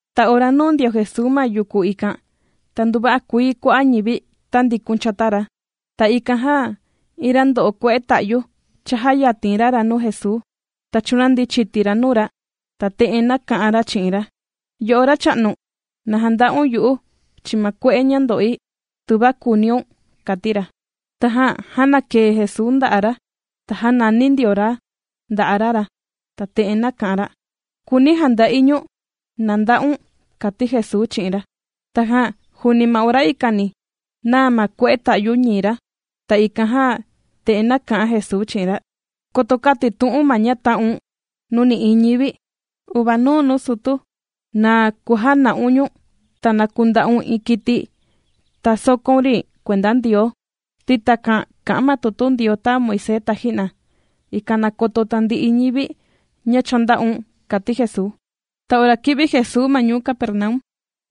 Ta ora nūu ndio Jesuu ma yuku ikan, ta nduva'a kuii kua'a' ñivi tāndikun chata ra. Ta ikan jan iin ra ndo'o kue'e ta'yu, chājayatin ra ra nuu Jesuu, ta chūnandi chiti ra nuu ra, ta te'en nāka'an ra chi'in ra: ―Yo'o Racha'nu, na janda'un yu'u chi'in ma kue'e ña ndo'i, tuva kùuniun ―kàti ra. Tajan jānakaa Jesuu nda'a' ra, ta jānani ndio ra nda'a' ra ra, ta te'en nāka'an ra: ―Kùuni̱ janda'i ñu̱n. Na nda'un ―kàti Jesuu chi'in ra. Tajan juuni ma ora ikani, nāa ma kue'e ta'yu ñii ra. Ta ikan jan te'en nāka'an Jesuu chi'in ra: ―Koto kätitu'u̱n ma ña tā'un nuu nï'iin ñivi, uvanuu nuu sutu, na kujana'un ñu̱n. Ta na kunda'un iin kiti, ta sòkóun ri kuenda Ndioo, ti takan kà'an ma tutu Ndioo tāa Moisés taji'na, ikan na koto tandi'i ñivi ña cha ndā'un ―kàti Jesuu. Ta ora kī'vi Jesuu ma ñuu Capernaum,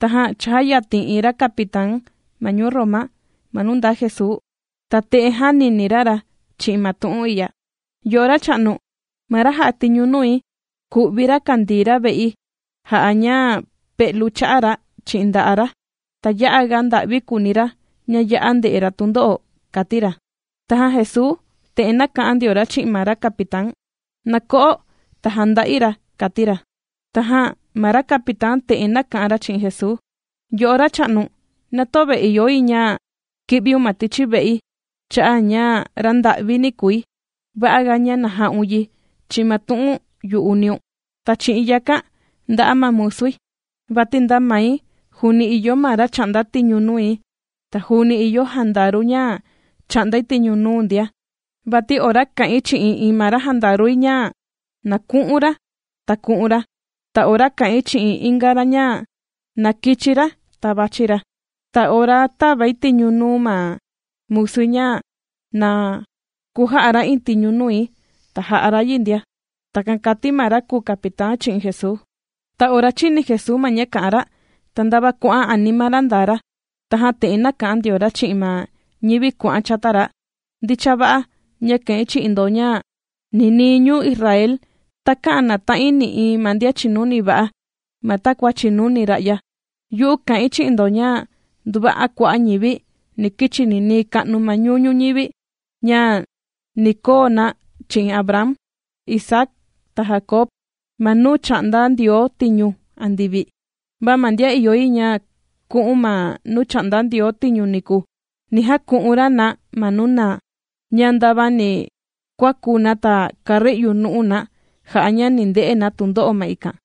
tajan chājayatin iin ra capitán ma ñuu Roma ma nuu ndaa Jesuu. Ta te'en jānini ra ra chi'in ma tu'un i'ya: ―Yo'o Racha'nu, ma ra jà'a tiñu nui, kù'vi ra kàndii ra ve'i jà'a ña pe'lu cha'a' ra chi'in nda'a' ra, ta ya'aga nda'vi kùuni ra ña ya'a ndè'e ra tundo'o ―kàti ra. Tajan Jesuu te'en nāka'an ndio ra chi'in ma ra capitán: ―Na ko'o ta jànda'i ra ―kàti ra. Tajan ma ra capitán te'en nāka'an ra chi'in Jesuu: ―Yo'o Racha'nu, na töve ìyo yi ña ki'viun ma tichi ve'i cha'a' ña ra nda'vini kùi, va'aga ña na ja'un yi chi'in ma tu'un yu'uniun, ta chi'in yakan nda'a ma musui. Vati nda mai, juuni ìyo ma ra chà'nda tiñu nui, ta juuni ìyo jandaru ña chà'ndai tiñu nuu ndia. Vati ora kà'in chi'in iin ma ra jandarui ña na ku'un ra, ta kuà'an ra, ta ora kà'in chi'in inga ra ña na kichi ra, ta vàchi ra. Ta ora tàvai tiñu nuu ma musui ña na kuja'a ra iin tiñu nui, ta jà'a ra yi ndia. ―Takan kàti ma ra kùu capitán chi'in Jesuu. Ta ora chīni Jesuu ma ña kā'an ra ta ndava kuà'an anima ra ndaa ra. Tajan te'en nāka'an ndio ra chi'in ma ñivi kuà'an chata ra: ―Ndicha va'a ña kà'in chi'in ndo ña ninii ñuu Israel takä'an nàta'in nï'iin ma ndian chìnuni va'a ma takua chìnuni ra'ya. Yu'u kà'in chi'in ndo ña nduva'a kua'a' ñivi, ni kichi ninii ka'nu ma nuñu'u' ñuñivi, ña ni koo na chi'in Abraham, Isaac, ta Jacob, ma nuu chà'nda Ndioo tiñu andivi. Va ma ndian ìyo yi ña ku'un ma nuu chà'nda Ndioo tiñu niku, ni jaku'un ra na ma nuu naa, ña ndava ni kuaku na ta kari'u nu'u na jà'a ña ni nde'e na tundo'o ma ikan.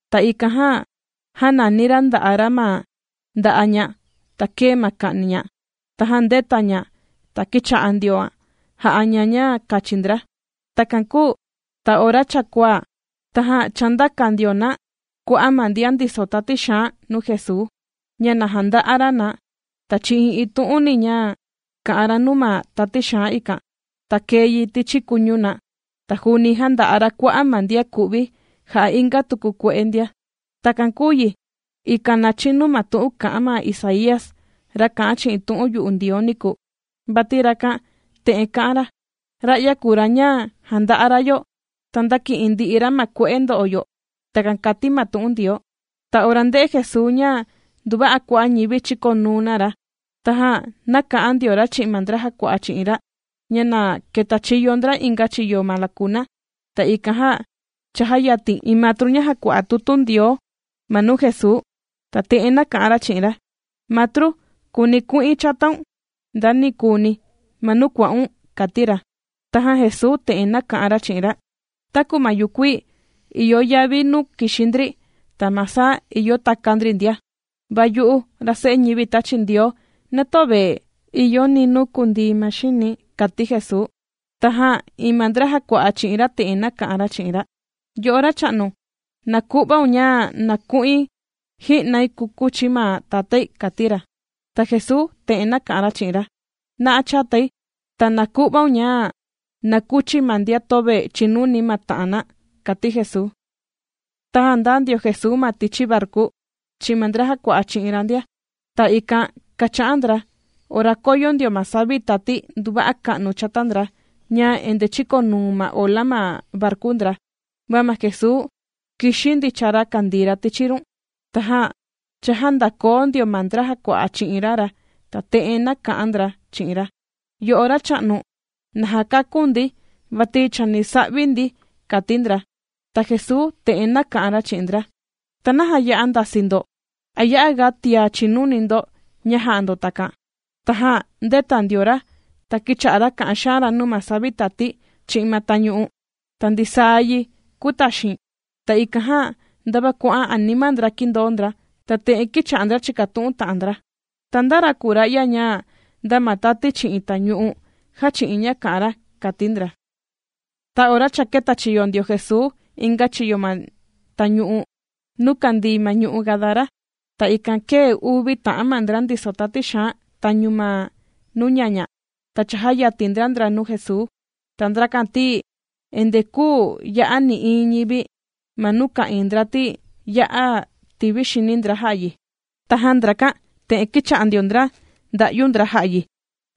Ta ikan jan jānani ra nda'a' ra, ma nda'a' ña, ta kēe ma ka'ni ña. Tajan ndēta ña, ta kīcha'a ndioan jà'a ña, ña kachi ndra. Takan kūu ta ora cha kuaa, tajan chāndaka ndio na kua'a' ma ndian ndiso tati xaan nuu Jesuu, ña na janda'a ra na. Ta chi'in iin tu'uni ña kā'an ra nuu ma tati xaan ikan, ta kēe yi ma tichi kuñu na, ta juuni jānda'a ra kua'a' ma ndian kù'vi jà'a inga tuku nuu kue'e ndia. Takan kūu yi, ikan na chinu ma tu'un kā'an ma Isaía, ra kā'an chi'in tu'un yu'u Ndioo niku. Vati rakan te'en kā'an ra: “Ra'ya kùu ra ña jānda'a ra yo, ta ndāki'in ndi'i ra ma kue'e ndo'o yo.” Takan kàti ma tu'un Ndioo. Ta ora ndē'e Jesuu ña nduva'a kua'a' ñivi chīkonuu na ra, tajan nāka'an ndio ra chi'in ma ndra jàkua'a chi'in ra, ña na ketachiyo ndra inga chiyo ma lakuna. Ta ikan jan chājayatin iin matru ña jàkua'a tutu Ndioo ma nuu Jesuu, ta te'en nāka'an ra chi'in ra: ―Matru, kùuni̱ ku'in chataun ndanikuni ma nuu kuà'un ―kàti ra. Tajan Jesuu te'en nāka'an ra chi'in ra: ―Taku ma yukuii ìyo yavi nuu kìxi ndri, ta ma saa ìyo taka ndri ndia, va yu'u ra Se'e ñivi tāchi Ndioo, na töve ìyo ni nuu kundii ma xini̱ ―kàti Jesuu. Tajan iin ma ndra jàkua'a chi'in ra, te'en nāka'an ra chi'in ra: ―Yo'o Racha'nu, na ku'vaun ña na ku'un ji'nai kukuchi̱ ma tatái ―kàti ra. Ta Jesuu te'en nāka'an ra chi'in ra: ―Na'a chatai, ta na ku'vaun ña na kuchi ma ndian töve chìnuni ma ta'an na ―kàti Jesuu. Tajan ndāa ndio Jesuu ma tichi varku, chi'in ma ndra jàkua'a chi'in ra ndia. Ta ikan kācha'an ndra, ora kōyo ndio ma savi tati nduva'a ka'nu chata ndra ña endee chīkonuu ma ola ma varku ndra. Va ma Jesuu kìxi ndicha ra kàndii ra tichi run. Tajan chājandakoo ndio ma ndra jàkua'a chi'in ra ra, ta te'en nāka'an ndra chi'in ra: ―¡Yo'o Racha'nu, na jakakun ndi, vati chani sa'vi ndi! ―kàti ndra. Ta Jesuu te'en nāka'an ra chi'in ndra: ―¿Ta naja ya'a ndasii ndo? ¿A ya'aga tia chìnuni ndo ña jà'a ndo takan? Tajan ndēta ndio ra, ta kīcha'a ra kà'an xaan ra nuu ma savi tati chi'in ma tañu'u, ta ndisaa yi kūtaxin. Ta ikan jan ndava kuà'an anima ndra kīndoo ndra, ta te'en kīcha'a ndra chìkatu'un ta'an ndra: ―¿Ta nda ra kùu ra'ya ña, nda ma tati chi'in tañu'u, jàchi'in ña kà'an ra? ―kàti ndra. Ta ora cha kētachiyo ndio Jesuu inga chiyo ma tañu'u nuu kandii ma ñu'u' Gadara, ta ikan kēe uvi ta'an ma ndra ndiso tati xaan tañu ma nuu ñaña, ta chājayatin ndra ndra nuu Jesuu. Ta ndrakan ti endee küu ya'a nï'iin ñivi ma nuu ka'ìin ndra ti, ya'a tivi xini ndra jà'a yi. Tajan ndrakan te'en kīcha'a ndio ndra nda'yu ndra jà'a yi: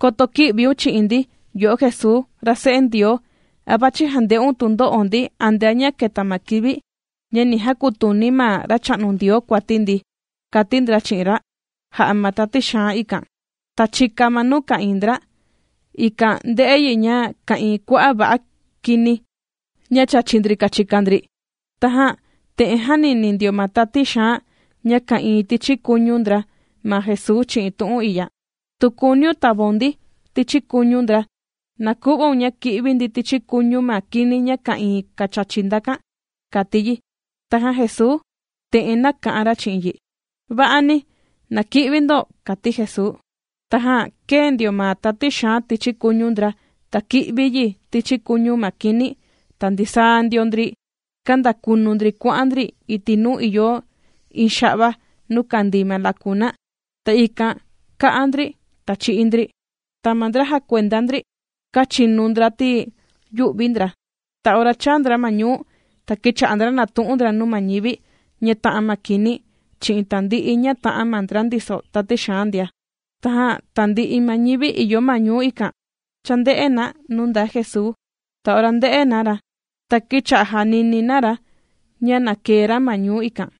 ―¡Koto kï'viun chi'in ndi, yo'o Jesuu, ra Se'e Ndioo! ¿A vàchi jànde'un tundo'o ndi antea ña keta ma kivi ña ni jakutuni ma Racha'nu Ndioo kuati ndi? ―kàti ndra chi'in ra, jà'a ma tati xaan ikan. Ta chika ma nuu ka'ìin ndra, ikan ndē'e yi ña ka'ìin kua'a' va'a kini, ña chàchi ndri kachika ndri. Tajan te'en jānini ndio ma tati xaan ña ka'ìin tichi kuñu ndra ma Jesuu chi'in tu'un i'ya: ―Tu kùuniun tavaun ndi tichi kuñu ndra, na ku'vaun ña ki'vi ndi tichi kuñu ma kini ña ka'ìin kachachi ndakan ―kàti yi. Tajan Jesuu te'en nāka'an ra chi'in yi: ―Va'ani, na ki'vi ndo ―kàti Jesuu. Tajan kēe ndio ma tati xaan tichi kuñu ndra, ta kī'vi yi tichi kuñu ma kini, ta ndisaa ndio ndri kāndakunu ndri kuà'an ndri iti' nuu ìyo iin xa'va nuu kandii ma lakuna, ta ikan kā'a ndri, ta chī'í ndri. Ta ma ndra jàkuenda ndri, kāchinu ndra ti yū'vi ndra. Ta ora chāa ndra ma ñuu, ta kīcha'a ndra nàtu'un ndra nuu ma ñivi ña tā'an ma kini chi'in tandi'i ña tā'an ma ndra ndiso tati xaan ndia. Tajan tandi'i ma ñivi ìyo ma ñuu ikan, chānde'e na nuu ndaa Jesuu. Ta ora ndē'e na ra, ta kīcha'a jànini na ra ña na kèe ra ma ñuu ikan.